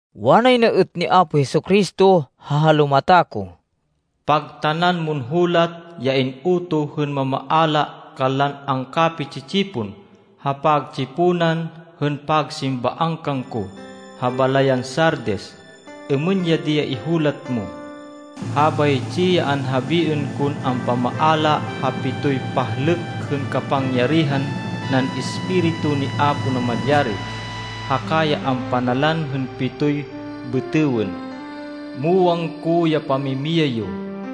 Wanay na êt ni Apo Jesu-Cristo ha halumata ko, “Pagtanan mon hulat ya in-utoh hên mamaala kanlan angkapi-tsi-tsipon ha pagtsiponan hên pagsimbaan kangko ha balayan Sardis. Êmên ya di ya ihulat mo: “Habaytsi ya anhabiên kon ampamaala ha pitoy pahlêk hên kapangyarihan nan Espiritu ni Apo Namalyari, haka ya ampanalan hên pitoy bêtêwên: muwang ko ya pamimiyay yo.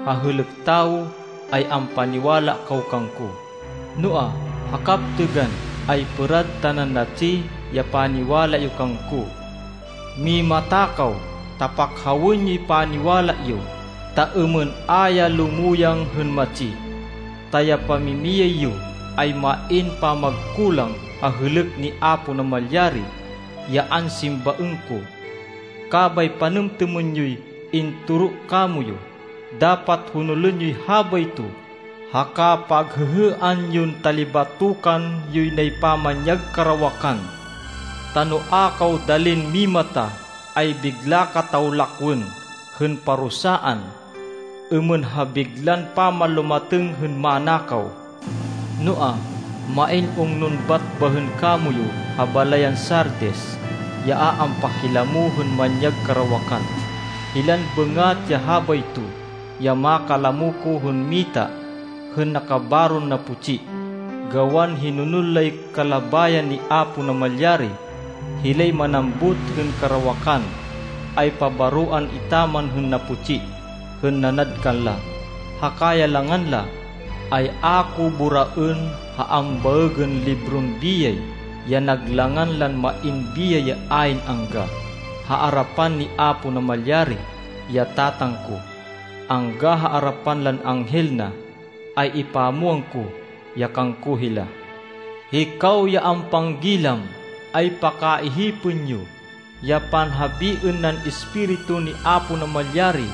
Ha hêlêk tawo, ay ampaniwala kaw kangko, noa, ha kaptêgan, ay pêrad tanan natsi ya paniwala yo kangko. Mimata kaw ta pakhawên yoy paniwala yo, ta êmên a ya lumuyang hên matsi, ta ya pamimiyay yo ay main pamagkulang ha hêlêk ni Apo Namalyari, ya ansimbaên ko. Kabay panêmtêmên yoy intoro kamoyu. Dapat honolên yoy habayto, haka paghêhêan yon talibatokan yoy nay pamanyag karawakan. Ta no a kaw dalin mimata, ay bigla kataw lakwên hên parusaan, êmên ha biglan pamanlumatêng hên manakaw. Noa, main ungnon bat bahên kamoyu ha balayan Sardis, ya a ampakilamo hên manyag karawakan. Hilan bêngat ya habayto ya makalamo ko hên mita hên nakabaron naputsi, gawan hinonol lay kalabayan ni Apo Namalyari. Hilay manambut hên karawakan, ay pabaroan etaman hên naputsi hên nanad kanla, haka ya langan la, ay a ko boraên ha ambaêgên libron biyay, ya nag langan lan main biyay ya ayn angga. Ha arapan ni Apo Namalyari, ya Tatang ko, angga ha arapan lan anghel na, ay ipamwang ko ya kangko hila. “Hikaw ya ampanggilam, ay pakaihipên yo ya panhabiên nan Espiritu ni Apo Namalyari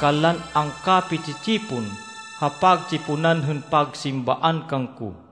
kanlan angkapi-tsi-tsipon ha pagtsiponan hên pagsimbaan kangko!”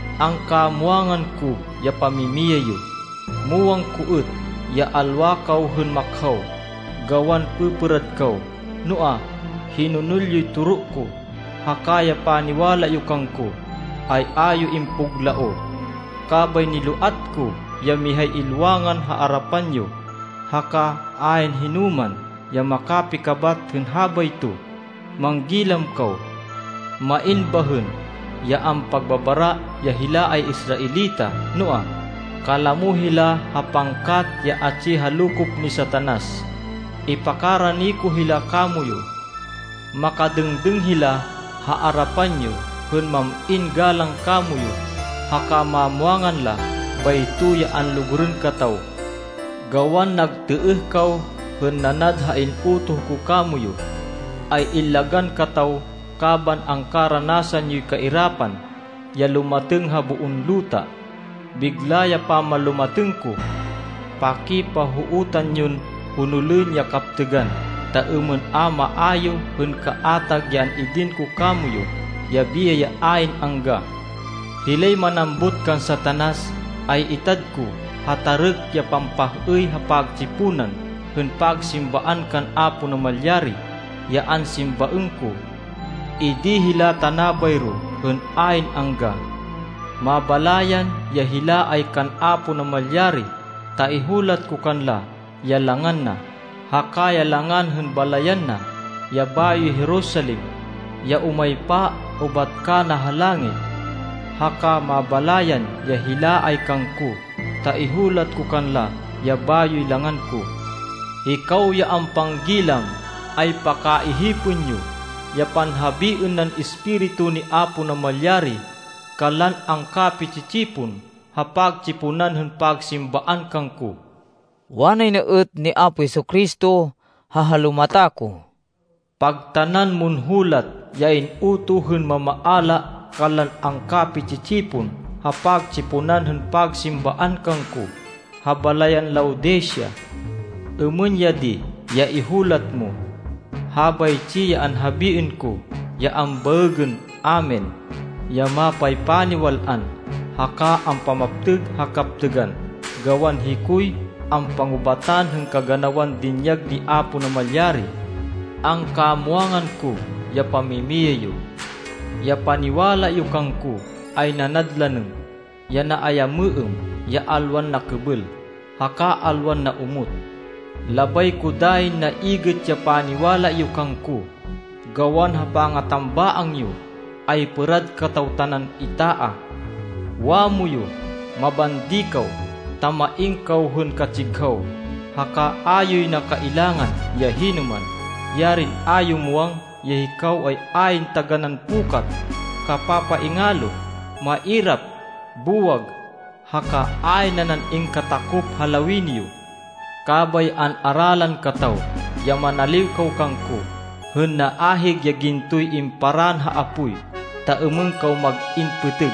Angkamwangan ko ya pamimiyay yo. Muwang ko êt ya alwa kaw hên makhaw, gawan pêpêrad kaw, noa, hinonol yoy toro ko, haka ya paniwala yo kangko, ay a yo impuglaoh. Kabay niloat ko ya mihay ilwangan ha arapan yo haka ayn hinoman ya makapikabat hên habayto. Manggilam kaw! Main bahên ya ampagbabara ya hila ay Israelita, noa, kalamo hila ha pangkat ya atsi ha lokop ni Satanas. Ipakarani ko hila kamoyu. Makadêngdêng hila ha arapan yo hên mam-in galang kamoyu, haka mamwangan la bayto ya anlugurên kataw. Gawan nagtêêh kaw hên nanad ha in-utoh ko kamoyu, ay illagan kataw kaban angkaranasan yoy kairapan ya lumatêng ha boon luta. Bigla ya pamanlumatêng ko! Pakipahootan yon honolên ya kaptêgan, ta êmên a maayu hên kaatag ya an-idin ko kamoyu, ya biyay ya ayn angga. Hilay manambut kan Satanas, ay itad ko ha tarêk ya pampah-êy ha pagtsiponan hên pagsimbaan kan Apo Namalyari, ya ansimbaên ko. Idi hila tana bayro hên ayn angga. Mabalayan ya hila ay kan Apo Namalyari ta ihulat ko kanla ya langan na, haka ya langan hên balayan na, ya bayoy Jerusalem, ya umaypa ubat kana ha langit. Haka Mabalayan ya hila ay kangko ta ihulat ko kanla ya bayoy langan ko. “Hikaw ya ampanggilam, ay pakaihipên yo ya panhabiên nan Espiritu ni Apo Namalyari kanlan angkapi-tsi-tsipon ha pagtsiponan hên pagsimbaan kangko!” Wanay na êt ni Apo Jesu-Cristo ha halumata ko, “Pagtanan mon hulat ya in-utoh hên mamaala kanlan angkapi-tsi-tsipon ha pagtsiponan hên pagsimbaan kangko ha balayan Laodicea. Êmên ya di ya ihulat mo: “Habaytsi ya anhabiên ko ya ambaêgên Amen, ya mapaypaniwal-an, haka ampamaptêg ha kaptêgan, gawan hikoy ampangubatan hên kaganawan dinyag ni Apo Namalyari. Angkamwangan ko ya pamimiyay yo. Ya paniwala yo kangko ay nanad lanêm ya naayamêêm, ya alwan nakêbêl haka alwan naomot. Labay ko dayin naigêt ya paniwala yo kangko. Gawan ha pangatambaang yo, ay pêrad kataw tanan itaah! Wamoyu mabandi kaw, ta main kaw hên katsighaw, haka a yoy na kailangan ya hinoman. Yarin a yo muwang ya hikaw ay ayn taganán pukat, kapapaingalo, mairap, buwag haka ayn nanan ingkatakop ha lawini yo! Kabay an-aralan kataw ya manaliw kaw kangko hên naahig ya gintoy imparann ha apoy, ta êmên kaw mag-in pêtêg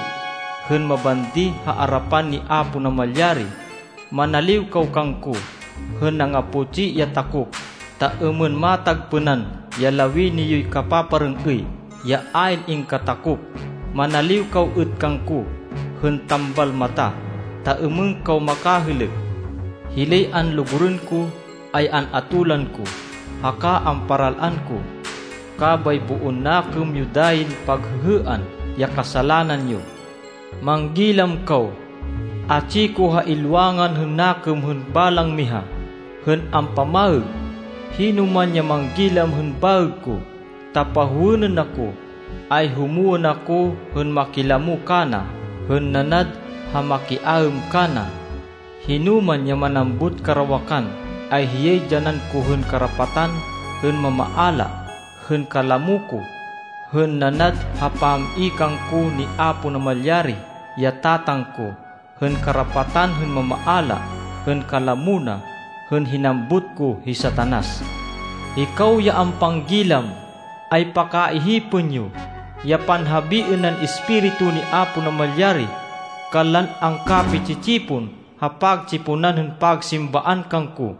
hên mabandi ha arapan ni Apo Namalyari. Manaliw kaw kangko hên nangaputsi ya takop, ta êmên matagpênan ya lawini yoy kapaparêng-êy, ya ayn ingkatakop. Manaliw kaw êt kangko hên tambal mata, ta êmên kaw makahêlêk. Hilay anlugurên ko ay an-atolan ko haka amparal-an ko. Kabay boon nakêm yo dayin paghêhêan ya kasalanan yo. Manggilam kaw! Atsi ko ha ilwangan hên nakêm hên balang miha hên ampamaêg. Hinoman ya manggilam hên baêg ko, ta pahowênên ako, ay humwên ako hên makilamo kana hên nanad ha makiaêm kana. Hinoman ya manambut karawakan, ay hiyay dyanan ko hên karapatan hên mamaala hên kalamo ko, hên nanad ha pam-i kangko ni Apo Namalyari, ya Tatang ko, hên karapatan hên mamaala hên kalamo na, hên hinambut ko hi Satanas. “Hikaw ya ampanggilam, ay pakaihipên yo ya panhabiên nan Espiritu ni Apo Namalyari kanlan angkapi-tsi-tsipon ha pagtsiponan hên pagsimbaan kangko!”